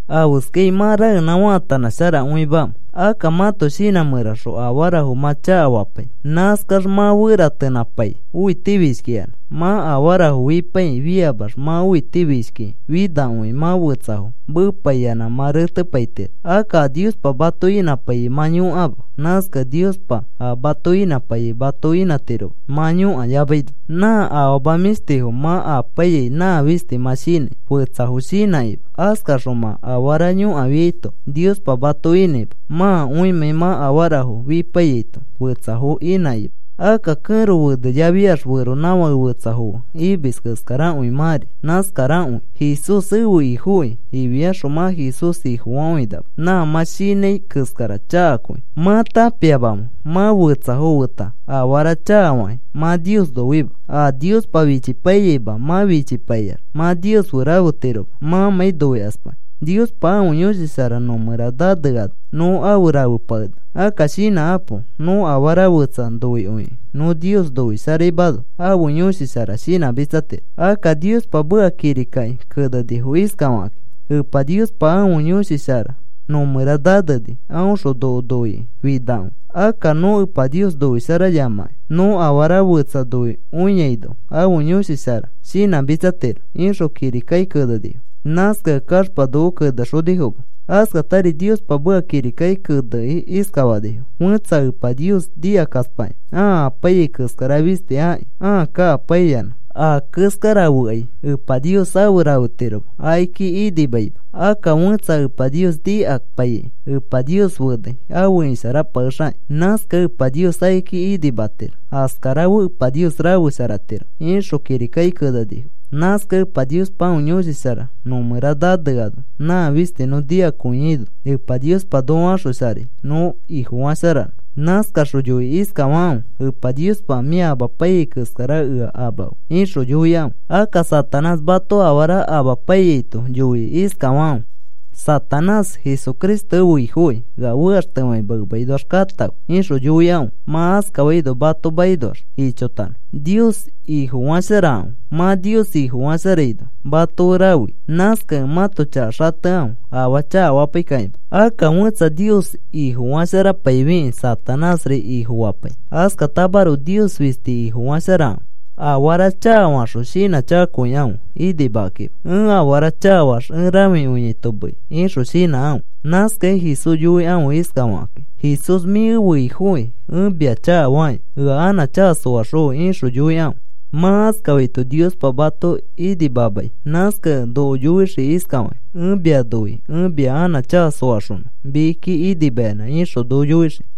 ¿Afeskai mã raenã faatanãsharakõimamẽ? Akka mãto shinã mẽraxõ afarafo mã chakafapai. Nãskax mã feratenã faatanãpai, õitifishkiyanã. Mã afarafo fipaikĩ fiamax mã õitifishkikĩ finakõikĩ mã fetsafo meepaiyanã mã retepaitiro. Akka a Niospa mato inãpaiyai mã yõkama. Nãskakẽ Niospa a mato inãpaiyai mato inãtiroma mã yõkayamaino. Nã afama mĩshtifo mã apaiyai nã fisti mã shinãi, fetsafo shinãkima. Askaxõ mã afara yõkafiaito Niospa mato inãima, mãkõimãi mã afarafo fipaiyaito fetsafo inãkima. Akka kẽro feneyafiax feronãfake fetsafo fe imis keskarakõi mãri nãskarakõi. “Jesús ẽfe Ifoki,” ifiaxõ mã Jesús Ifofakõinama. Nã mã shinãi keskara chakakõi. ¿Mã tãpiamamẽ mã fetsafo feta afara chakafakĩ, mã Nios noima? A Niospa fichipaiyaima, mã fichipaiax mã Nios fe rafetiroma mãmãi noikaspakĩ. Niospa ãfe Yõshi Shara nõ mẽra naneano nõ afe rafepakenaka. Akka shinãkapo. Nõ afara fetsa noikõikĩ nõ Nios noisharaimano ãfe Yõshi Shara shinãmitsatiro. Akka Niospa meka kirikaki kenenifo iskafakakĩ: “Epa Niospa ãfe Yõshi Shara nõ mẽra naneni. Aõxõ noko noikĩ finakõi. Akka nõ Epa Nios noisharayamakĩ nõ afara fetsa noikõiaino ãfe Yõshi Shara shinãmitsatiro,” ixõ kirikaki kenenifo. Nãskakẽ kaxpa noko kenexonifoma. Askatari Niospa meka kirikaki kenekĩ iskafanifo: “Fẽtsa Epa Nios nikakaspakĩ ãa apaiyai keskara fisti aki ãa kakapaiyanã, aa keskara fekai, Epa Nios afe rafetiroma, akiki inimaima. Akka fẽtsa Epa Nios nikapaikĩ Epa Nios fenai afe isharapakexakĩ. Nãskakẽ Epa Nios akiki inimatiro, askara fe Epa Nios rafesharatiro,” ixõ kirikaki kenenifo. Nãskakẽ Epa Niospa ãfe Yõshi Shara nõ mẽra naneano nã fisti nõ noikõiaino Epa Niospa noko axosharai nõ Ifofasharanõ. Nãskaxõ yoikĩ iskafakãfe: “Epa Niospa, mĩa amapaiyai keskara ea amafe,” ixõ yoikãfe. Akka Satanás mato afara amapaiyaito yoikĩ iskafakãfe: “Satanás, Jesucristo ẽfe Ifokĩ ea fekaxtefakima, emakinoax katãfe,” ixõ yoikãfe. Mã askafaino mato makinoax ichotanõ. Nios Ifofasharakãfe. Mã Nios Ifofasharaino mato fe rafei. Nãskakẽ mãto chaka xatekãfe afaa chakafapaikakima. Akka fẽtsa Nios Ifofasharapaifikĩ, Satanásri ifofapai, askatamaroko, Nios fisti Ifofasharakãfe. Afara chakafaxõ shinãchakakõikãfe inimakakima. “Ẽ afara chakafaax ẽ rãfikõiaito meei,” ixõ shinãkãfe. Nãskakĩ Jesús yoikãfe iskafakakĩ: “Jesús mĩ ẽfe Ifofekẽ ẽ mia chakafaki. Ea anã chaka soaxõfe,” ixõ yoikãfe. Mã askafaito Niospa mato inimamai. Nãskakẽ noko yoixii iskafakĩ: “Ẽ mia noi. Ẽ mia anã chaka soaxonõ, mikiki inimayanã,” ixõ noko yoixii.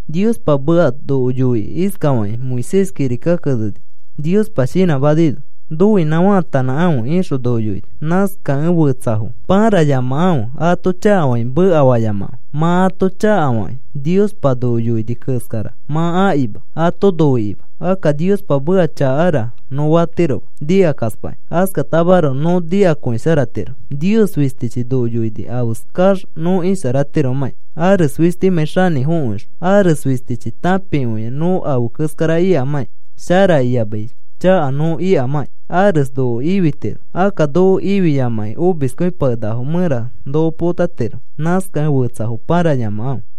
Niospa meka noko yoikĩ iskafakĩ Moisés kirikaki keneni, Niospa shinãmanaino, “Nõinã faatanãkãfe,” ixõ noko yoini. Nãskakẽ fetsafo pãrayamakãfe, ato chakafakĩ mekafayamakãfe. Mã ato chakafakĩ Niospa noko yoini keskara mã akima ato noikĩma. Akka, “Niospa meka chakara,” nõ fatiroma nikakaspakĩ. Askatamaroko nõ nikakõisharatiro. Nios fistichi noko yoini afeskax nõ isharatiromãkĩ, ares fistimãi xanĩfokõixõ. Ares fistichi tãpikõia nõ afe keskara ikamãkĩ, shara iyamai chaka nõ ikamãkĩ. Ares noko ifitiro. Akka noko ifiyamakĩ omiskõipakenakafo mẽra noko potatiro. Nãskakẽ fetsafo pãrayamakãfe.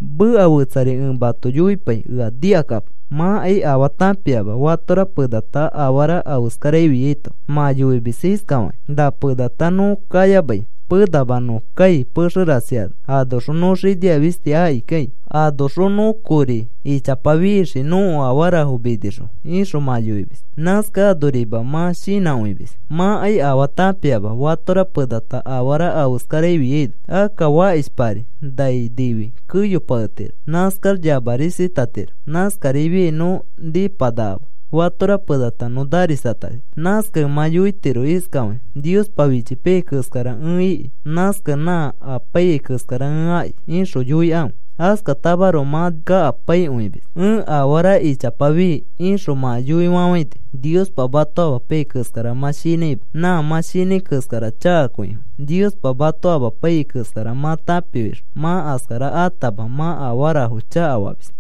Meka fetsari ẽ mato yoipai. Ea nikakapo. Mãkai afaa tãpiama fatora penata afara afeskara ifiaito mã yoimis iskafakĩ: “Na penata nõ kayamai, penama nõ kai pexe rasi ano. Anoxõ nõ xinia fisti akikai. Anoxõ nõ kori ichapa fixii nõko afarafo minixõ,” ixõ mã yoimis. Nãskakẽ anorima mã shinãkõimis. Mãkai afaa tãpiama fatora penata afara afeskara afiaino. Akka fakishpari nai nifi keyopaketiro. Nãskax yamarisatatiro. Nãskarifiai nõ nĩpanakama. Fatora penata nõ narisatani. Nãskakẽ mã yoitiro iskafakĩ: “Niospa fichipaiyai keskara ẽ iki. Nãskakẽ nã apaiyai keskara ẽ aki,” ixõ yoikãfe. Askatamaroko mã kakapaikõimis. “Ẽ afara ichapa fii,” ixõ mã yoifafãini. Niospa mato amapaiyai keskara mã shinãima. Nã mã shinãi keskara chakakõifo. Niospa mato amapaiyai keskara mã tãpifixõ mã askara atama mã afarafo chakafamis.